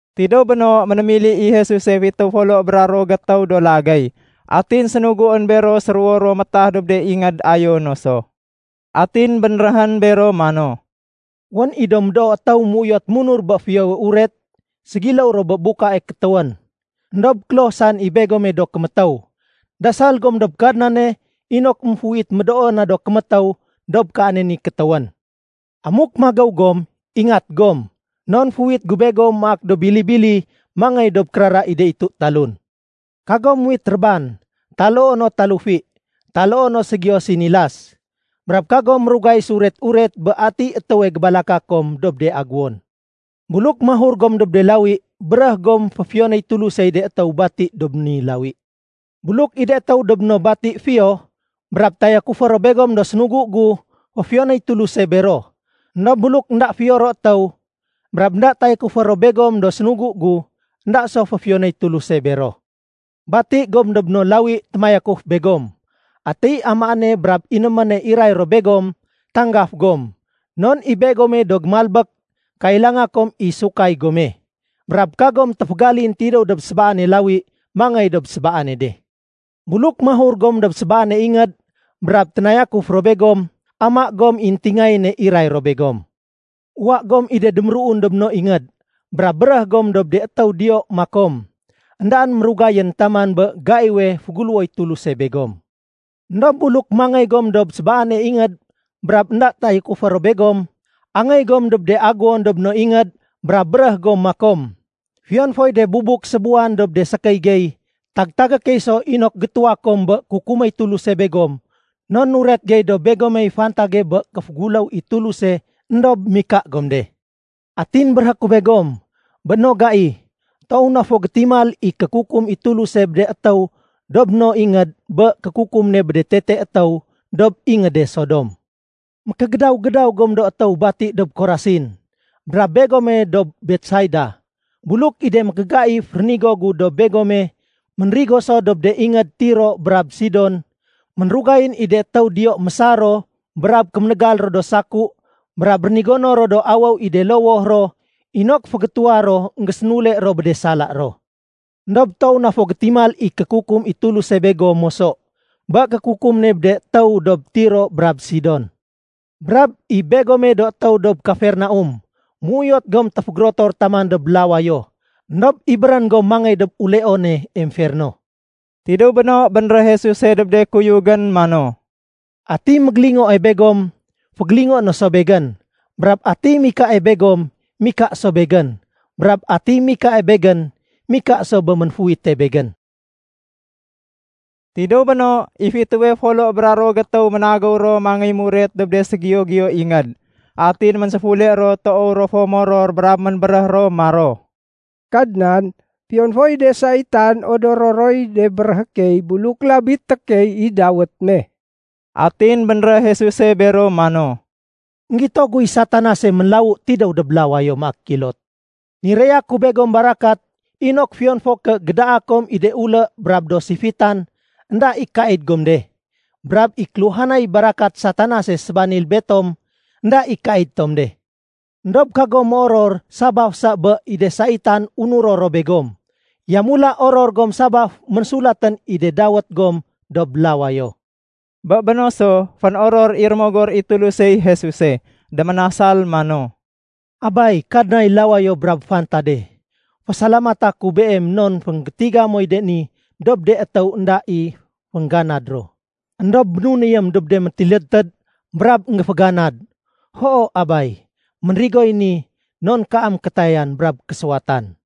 Tidéw béno, ménémili i Jesuse fitéw folo bra ruwo gétéw do lagéy. Atin sénuguén bero séruwo-ruwo métah dob de ingéd ayo no so. Atin bénréhén bero mano, “Wén i médoo do étéw méuyot munur bé Fiyowe Uret. Ségiléw ro bé de buka kétéwén. Endob kloh saén i begome do kémétéw. Dasal gom dob Kadnane inok émféuwit médoo na do kémétéw dob kaane ni kétéwén. Amuk magéw gom, ingat gom. Non féuwit gu begom maak do bili-bili mangéy dob kérara i de itu talun. Kagom muwit réban, taloo no talufi, taloo no ségiyo sinilas. Brab kagom mérugay séuret-uret bé atiy étéwe gébalaka kom dob de aguwon. Buluk mahur gom dob de lawi, béréh gom féfiyonéy Tulusey de étéw bati dob ni lawi. Buluk i de étéw dob no bati fiyo, brab tayakufé ro begom do sénugu gu, féfiyonéy Tuluse bero. Endob buluk énda fiyo ro étéw, brab énda tayakufé ro begom do sénugu gu, énda so féfiyonéy Tuluse bero. Bati gom dob no lawi témayakuf begom. Atiy amaéne brab inéméne iray ro begom, tanggaf gom. Non i begome do gémalbék kailanga kom i sukay gome. Brab kagom téfégalin tidéw dob sébaane lawi mangéy dob sébaane de. Buluk mahur gom dob sébaane ingéd, brab ténayakuf ro begom, ama gom i éntingayéne iray ro begom. Uwa gom i de déméruun dob no ingéd brab béréh gom dob de étéw diyo makom, ‘Endaén mérugayén taman bé gaiwe féguléwoy Tuluse begom.’ Endob buluk mangéy gom dob sébaane ingéd brab énda tayakufé ro begom, angéy gom dob de aguwon dob no ingéd brab béréh gom makom, ‘Fiyon foy de bubuk sébuwan dob de sékéy gey, tag-tagé key so inok gétuwa kom i kukuméy Tuluse begom non nuret gey dob begomey fantage bé kéféguléw i Tuluse éndob mika gom de.’ Atin béréhé ku begom, bé no gai, toow na fo gétimal i kékukum i Tuluse bé de étéw dob no ingéd bé kékukum ne bé de tete étéw dob ingéde Sodom. “Mékégédaw-gédaw gom do étéw bati dob Korasin, brab begome dob Betsaida. Buluk i de mékégaif rénigo gu dob begome ménrigo so dob de ingéd Tiro brab Sidon, ménrugayén i de étéw diyo mésar ro brab kéménégal ro do saku brab rénigono ro do awéw i de lowoh ro inok fégétuwa ro énggésénule ro bé de sala ro. Endob toow na fo gétimal i kékukum i Tuluse begom moso bé kékukum ne bé de étéw dob Tiro brab Sidon. Brab i begome do étéw dob Kafernaum, méuyot gom téfégérotor taman dob lawayo. Endob ibérén gom mangéy dob uleone emferno.” Tidéw béno, bénréh Jesuse dob de kuyugén mano, “Atiy mégélingoe begom, fégélingoé no so Begén. Brab atiy mikae begom, mika so Begén. Brab atiy mikae Begén, mika so bé Ménféuwite Begén.” Tidéw béno, i fitéwe folo bra ruwo gétéw ménagéw ro mangéy muret dob de ségiyo-giyo ingéd. Atin ménséfule ro toow fo moror brab ménbéréh ro maro, “Kadnan, fiyon foy de saitan odoro roy de béréhé key buluk labité key i dawét me.” Atin bénréh Jesuse bero mano, “Enggito guy Satanase ménlawu tidéw dob lawayo maak kilot. Niraya ku begom barakat inok fiyon fo ké gédaa kom i de ulé brab do sifitan, énda i kaid gom de. Brab i kéluhanay barakat Satanase sébanil betom énda i kaid tom de. Endob kagom méoror sabaf sa bé i de saitan unuro ro begom. Yamula oror gom sabaf ménsulatén i de dawét gom dob lawayo.” Bé béno so, fénoror i Rémogor i Tulusey Jesuse. Déménasal mano, “Abay Kadnay lawayo brab fantade, fésalamata ku Beem non fénggétiga moy ni dob de étéw énda i féngganad ro, éndob bénunéyém dob de métilédtéd brab énggéféganad. Hoo Abay, ménrigoy ni non kaam kétayan brab késuwatan.”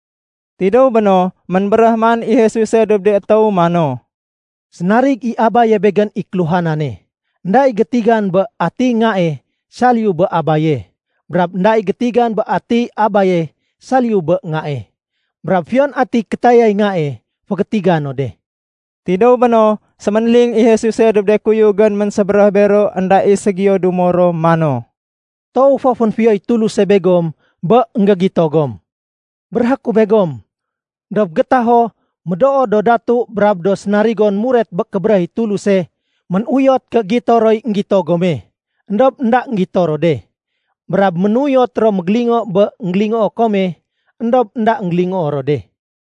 Tidéw béno, ménbéréh man i Jesuse dob de étéw mano, “Sénarig i Abaye Begén i kéluhanane. Enda i gétigan bé atiy Ngae saliyu bé Abaye. Brab énda i gétigan bé atiy Abaye saliyu bé Ngae, brab fiyon atiy kétayay Ngae fégétigan no de.” Tidéw béno, séménling i Jesuse dob de kuyugén ménsébéréh bero énda i ségiyo dumo ro mano, “Toow fo fénfiyoy Tuluse begom bé énggégito gom. Béréhé ku begom, dob gétaho médoo do datu brab do sénarigon muret bé kébéréh i Tuluse ménuyot ké gito roy énggito gome, éndob énda énggito ro de. Brab ménuyot ro mégélingo bé énggélingoo kome, éndob énda énggélingoo ro de.”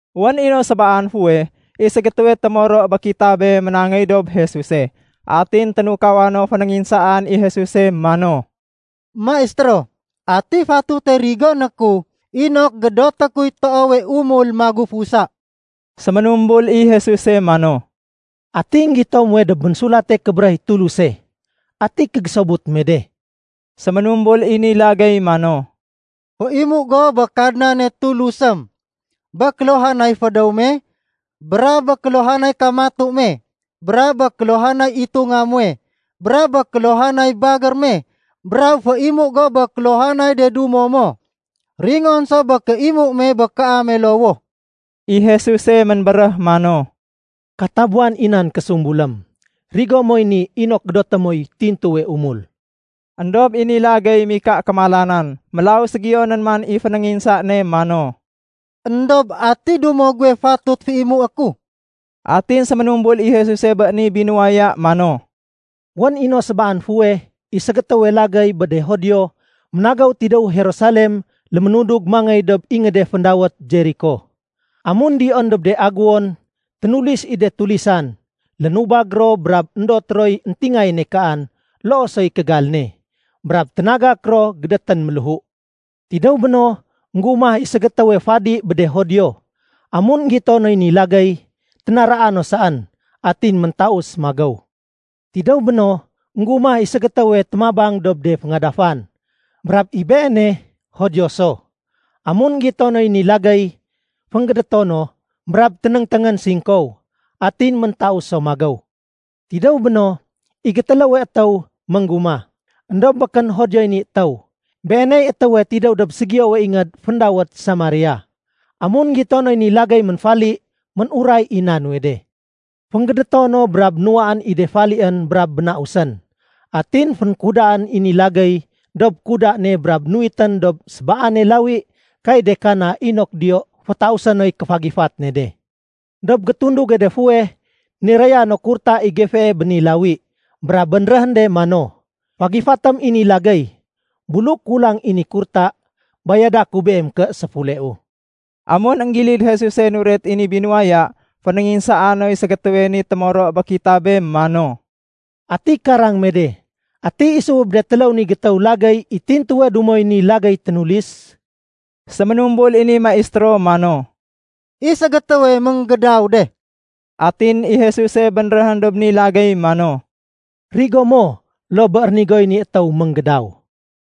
Wén i no sébaan fuweh, i ségétéwe témoro bé kitabé ménangéy dob Jesuse. Atin ténukawa no fénénginsaan i Jesus mano, “Maistéro, ati fatute rigoné ku inok gédoté kuy toowe umul magufusa?” Séménumbul i Jesuse mano, “Ati énggito muwe dob Ménsulate Kébéréh i Tuluse? Ati kégésobut me de?” Séménumbul i ni lagéy mano, “Féimu go bé Kadnane Tulusém bé kéluhanay fédéw me, brab bé kéluhanay kamatu me, brab bé kéluhanay itunga muwe, brab bé kéluhanay bagér me. Brab féimu go bé kéluhanay de dumo mo ringon so bé kéimu me bé kaame lowoh.” I Jesuse ménbéréh mano, “Katabuwan i nan késumbulém. Rigo moy ni inok gédoté moy tintuwe umul.” Endob i ni lagéy mika kémalanan. Mélaw ségiyo nén man i fénénginsa ne mano, “Endob ati dumo guwe fatut féimué ku?” Atin séménumbul i Jesuse bé ni binuwaya mano, “Wén i no sébaan fuweh, i ségétéwe lagéy bé de Judio ménagéw tidéw Jerusalem léménudug mangéy dob ingéde féndawét Jeriko. Amun diyoén dob de agéwon, ténulis i de tulisan. Lénubag ro, brab éndot roy éntingayéne kaan loo soy kégal ne. Brab ténagak ro gédétén méléhu. Tidéw béno, ménggumah i ségétéwe fadi bé de Judio. Amun énggito noy ni lagéy, ténaraa no saén, atin méntaus magéw. Tidéw béno, ménggumah i ségétéwe témabang dob de féngadafan, brab i beene Judio so. Amun énggito noy ni lagéy, fénggédéto no brab ténéngténgén singkow, atin méntaus so magéw. Tidéw béno, i gétéléwe étéw ménggumah. Endob békén Judioy ni étéw. Beeney étéwe tidéw dob ségiyowe ingéd féndawét Samaria. Amun énggito noy ni lagéy ménfali, ménuray i éna nuwe de. Fénggédéto no brab nuwaén i de falién brab bénausén. Atin fénkudaén i ni lagéy dob kuda ne brab nuwitén dob sébaane lawi kay de kana inok diyo fétausé noy kéfagifat ne de. Dob gétunduge de fuweh, niraya no kurta i gefee bé ni lawi, brab bénréhén de mano, ‘Fagifatém i ni lagéy. Buluk kulang i ni kurta, bayada ku beem ké séfuleu.’” Amun énggilid Jesuse nuret i ni binuwaya, fénénginsaa noy ségétéwe ni témoro bé kitabé mano, “Ati karang me de, ati isuwe bé de téléw ni gétéw étéw i tintuwe dumoy ni lagéy ténulis?” Séménumbul i ni maistéro mano, “I ségétéwe ménggédaw de.” Atin i Jesuse bénréhén dob ni lagéy mano, “Rigo mo loo bé rénigoy ni étéw ménggédaw.”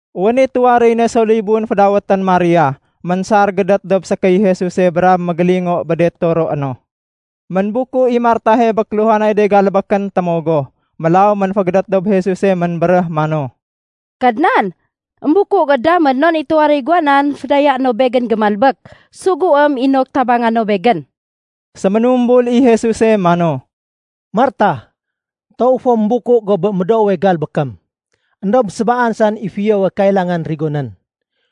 Wén i tuwaréy ne so libun fédawétén Maria. Ménsar gédét dob sékéy Jesuse brab mégélingo bé de toroé no. Ménbuku i Martahe bé kéluhanay de galbékén témogoh, mélaw ménfégédét dob Jesuse ménbéréh mano, “Kadnan, émbuku go damén non i tuwaréy guwa nan fédayaé no begén gémalbék. Suguém inok tabanga no begén.” Séménumbul i Jesuse mano, “Martah, toow fo ménbuku go bé médoowe galbékém. Endob sébaan saén i fiyowe kailangan rigonén.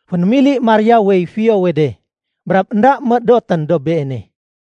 Fénémili Mariawey fiyowe de. Brab énda médotén dob beene.”